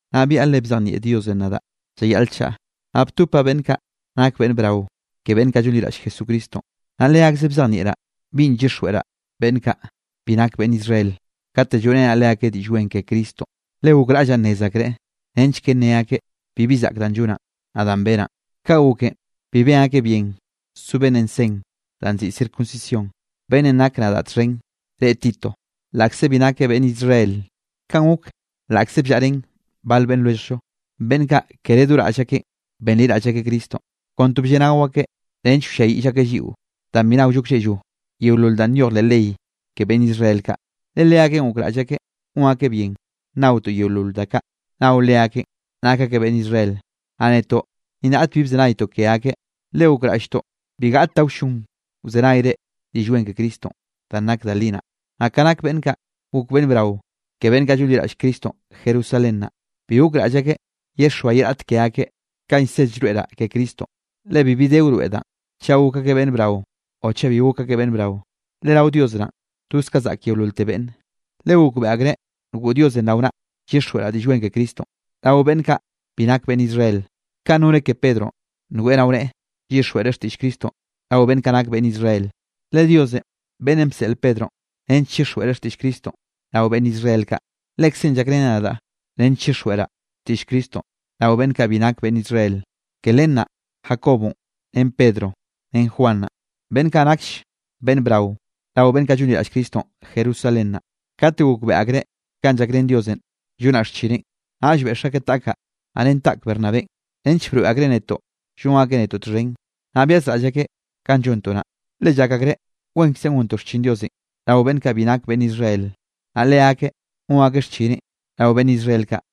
Naꞌ byaꞌa le bzejnieꞌ Diosenꞌ nadaꞌ llayaꞌl chaꞌa. Naꞌ btopaꞌ beꞌnn kaꞌ nak beꞌnn brao ke beꞌnn kaꞌ llonliraꞌll Jesucristonꞌ, naꞌ leakzeꞌ bzejnieꞌraꞌ binꞌ llyixjweꞌraꞌ beꞌnn kaꞌ bi nak beꞌnn Israel kate lloeꞌrenaꞌ leakeꞌ Diꞌll Wen ke Cristonꞌ, le gokraꞌllaꞌ nnez akreꞌ nench ke nne akeꞌ bibi zaꞌk danꞌ llonaꞌn, naꞌ danꞌ benaꞌn. Ka goken bi ben akeꞌ bien so beꞌnnenꞌ sen danꞌ nziꞌi circuncisión, beꞌnnenꞌ nakeꞌ nadaꞌ txhen reꞌe Tito laꞌkze bi nakeꞌ beꞌnn Israel. Kanꞌ gok laꞌkze bllaꞌa ren bal beꞌnn lwelljllo, beꞌnn kaꞌ kere do raꞌll akeꞌn benliraꞌll akeꞌ Cristonꞌ, kon to blleꞌnao akeꞌ nench wlliayiꞌll akeꞌ lliꞌo, danꞌ bi naollo klleꞌllo yeolol danꞌ nyoj leꞌ ley ke beꞌnn Israel kaꞌ. Le leakeꞌn gokraꞌll akeꞌ gon akeꞌ bien nnaotoꞌ yeolol da kaꞌ nao leakeꞌn nak akeꞌ beꞌnn Israel. Naꞌ netoꞌ ni raꞌt bi bzenaytoꞌ ke akeꞌ, le gokraꞌlltoꞌ bi gaꞌt da wllon wzenayre Diꞌll Wen ke Cristonꞌ danꞌ nak da li naꞌ. Naꞌ ka nak beꞌnn kaꞌ gok beꞌnn brao ke beꞌnn kaꞌ llonliraꞌll Cristonꞌ Jerusalén naꞌ, bi gokraꞌll akeꞌ yexoa ye raꞌt ke akeꞌ kanꞌ llsed llroeꞌraꞌ ke Cristonꞌ. (Le bibi de wroeꞌ danꞌ, chaꞌ gok akeꞌ beꞌnn brao o chaꞌ bi gok akeꞌ beꞌnn brao, le rao Dios naꞌn toz ka zaꞌk yeololte beꞌnne.) Le gokbeꞌe akreꞌ ngoꞌ Diosenꞌ rao naꞌ, llyixjweꞌraꞌ Diꞌll Wen ke Cristonꞌ rao beꞌnn kaꞌ bi nak beꞌnn Israel, kanꞌ noneꞌ ke Pedronꞌ ngoeꞌ rao neꞌe llyixjweꞌreꞌ xtiꞌll Cristonꞌ rao beꞌnn kaꞌ nak beꞌnn Israel. Le Diosenꞌ beꞌnnenꞌ bseꞌl Pedronꞌ nench chixjweꞌreꞌ xtiꞌll Cristonꞌ rao beꞌnn Israel kaꞌ, Lekzeꞌn llakreneꞌ nadaꞌ nench llyixjweꞌraꞌ xtiꞌll Cristonꞌ rao beꞌnn kaꞌ bi nak beꞌnn Israel. Ke len naꞌ Jacobonꞌ ren Pedronꞌ ren Juan naꞌ, beꞌnn kaꞌ nakll beꞌnn brao rao beꞌnn kaꞌ llonliraꞌll Cristonꞌ Jerusalén naꞌ, kate gokbeꞌe akreꞌ kanꞌ llakrén Diosenꞌ llonaꞌ xchineꞌn, naꞌll beꞌx akeꞌ taꞌkaꞌ, naꞌ ren taꞌk Bernabénꞌ nench broeꞌ akreꞌ netoꞌ llon akeꞌ netoꞌ txhen, naꞌ byazraꞌll akeꞌ kanꞌ llontoꞌ naꞌ. Le llak akreꞌ wenkzenꞌ gontoꞌ xchin Diosenꞌ rao beꞌnn kaꞌ bi nak beꞌnn Israel, naꞌ leakeꞌ gon akeꞌ xchineꞌn rao beꞌnn Israel kaꞌ.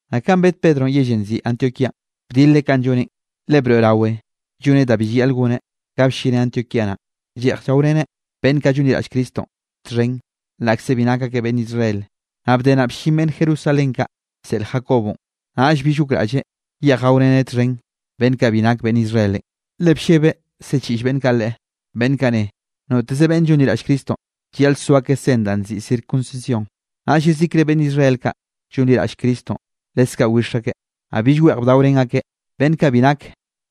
Naꞌ kanꞌ bed Pedronꞌ yellenꞌ nziꞌi Antioquíanꞌ bdileꞌ kanꞌ lloneꞌn, le broeꞌrawe lloneꞌ danꞌ bi llayaꞌl goneꞌ. Ka bllineꞌ Antioquía naꞌ, lleꞌj llaoreneꞌ beꞌnn kaꞌ llonliraꞌll Cristonꞌ txhen laꞌkze bi nak akeꞌ beꞌnn Israel. Naꞌ bde naꞌ bllin beꞌnn Jerusalén kaꞌ bseꞌl Jacobonꞌ, naꞌll bill gokraꞌlleꞌ yeꞌj gaoreneꞌ txhen beꞌnn kaꞌ bi nak beꞌnn Israelenꞌ. Le bllebeꞌ siꞌchiꞌll beꞌnn kaꞌ leꞌe, beꞌnn kaꞌ ne, noteze beꞌnn llonliraꞌll Cristonꞌ, llayaꞌl so akeꞌ sen danꞌ nziꞌi circuncisión. Naꞌll yezikre beꞌnn Israel kaꞌ llonliraꞌll Cristonꞌ leskaꞌ wix akeꞌ, naꞌll bill weꞌj bdaorén akeꞌ beꞌnn kaꞌ bi nak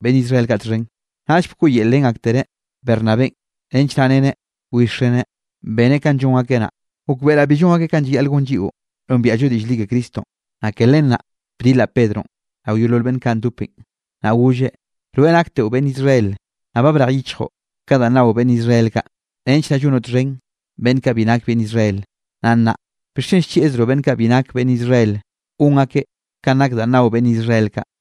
beꞌnn Israel kaꞌ txhen, naꞌll bkoꞌyelrén aktereꞌ Bernabénꞌ nench naꞌ reneꞌ wixreneꞌ, beneꞌ kanꞌ llon akeꞌ naꞌ. Gokbeꞌraꞌ bi llon akeꞌ kanꞌ llayaꞌl gon lliꞌo nombiaꞌllo diꞌll li ke Cristonꞌ. Naꞌ ke len naꞌ bdilaꞌ Pedronꞌ rao yeolol beꞌnn kaꞌ ndopenꞌ, naꞌ golleꞌ: “Rweꞌ nakteꞌo beꞌnn Israel, naꞌ ba brej yichjoꞌ ka danꞌ nao beꞌnne Israel kaꞌ, nench naꞌ llonoꞌ txhen beꞌnn kaꞌ bi nak beꞌnn Israel. Naꞌ nnaꞌ, ¿bixchen llchieꞌzroꞌ beꞌnn kaꞌ bi nak beꞌnn Israel gon akeꞌ kanꞌ nak danꞌ nao beꞌnn Israel kaꞌ?”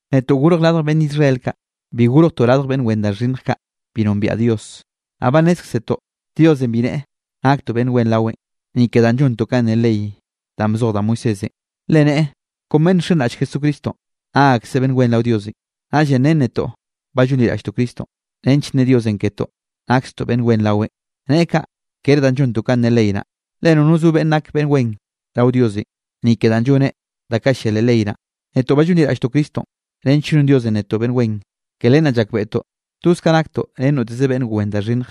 Netoꞌ gorj radj beꞌnn Israel kaꞌ, bi gorjtoꞌ radj beꞌnn wen da xhinnj kaꞌ bi nombiaꞌ Dios. Naꞌ ba nnézkzetoꞌ Diosenꞌ bi neꞌe naktoꞌ beꞌnn wen raweꞌn, ni ke danꞌ llontoꞌ kanꞌ ne leꞌ ley danꞌ bzoj da Moisésenꞌ. Le neꞌe kon beꞌnn nxenraꞌll Jesucristonꞌ, nak akseꞌ beꞌnn wen rao Diosenꞌ. Naꞌllenꞌ ren netoꞌ ba llonliraꞌlltoꞌ Cristonꞌ nench nne Diosenꞌ ketoꞌ nakstoꞌ beꞌnn wen raweꞌn. Neꞌe kaꞌ kere danꞌ llontoꞌ kanꞌ ne ley naꞌ, le nono zo beꞌnn nak beꞌnn wen rao Diosenꞌ, ni ke danꞌ lloneꞌ da kaꞌ llia leꞌ ley naꞌ. Netoꞌ ba llonliraꞌlltoꞌ Cristonꞌ nench non Diosenꞌ netoꞌ beꞌnn wen. Ke len naꞌ llakbeꞌtoꞌ toz kaꞌ naktoꞌ ren noteze beꞌnn wen da xhinnj.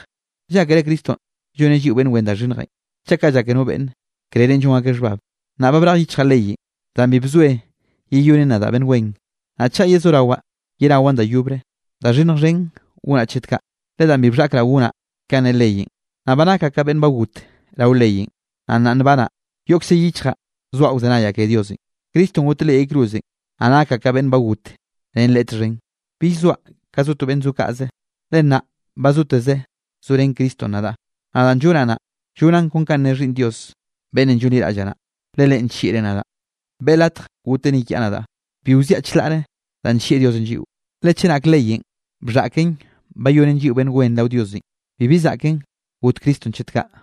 ¿Llákere Cristonꞌ lloneꞌ lliꞌo beꞌnn wen da xhinnjenꞌ? Chaꞌ kaꞌ llake no beꞌnne, krerenꞌ llon akeꞌ xhbab. Naꞌ ba brej yichjaꞌ leyenꞌ danꞌ bi bzoe yeyonen nadaꞌ beꞌnn wen, naꞌ chaꞌ yezorawaꞌ yenawaꞌn da yobre, da xhinnj xhen gonaꞌ chet ka. Le danꞌ bi bxhaꞌkraꞌ gonaꞌ kanꞌ ne leyenꞌ, naꞌ ba nakaꞌ ka beꞌnn ba got rao leyenꞌ, naꞌ nnaꞌ nbanaꞌ yoꞌkze yichjaꞌ soaꞌ wzenayaꞌ ke Diosenꞌ. Cristonꞌ goteꞌ leꞌ yay cruzenꞌ, naꞌ nakaꞌ ka beꞌnn got ren Leꞌe txhen. Bill zoaꞌ ka zo to beꞌnn zo kaꞌze, le nnaꞌ ba zoteze zorén Cristonꞌ nadaꞌ. Naꞌ danꞌ llonaꞌ naꞌ, llonaꞌn kon kanꞌ ne Xhiꞌnn Dios beꞌnnenꞌ llonliraꞌllaꞌ naꞌ. Le Leꞌen nllieꞌreꞌ nadaꞌ beꞌe latj goteꞌ ni kiaꞌ nadaꞌ. Bi wziaꞌ chlaꞌre danꞌ nllieꞌ Diosenꞌ lliꞌo. Le chenak leyenꞌ bxhaꞌken bayonen lliꞌo beꞌnn wen rao Diosenꞌ, bibi zaꞌken got Cristonꞌ chet kaꞌ.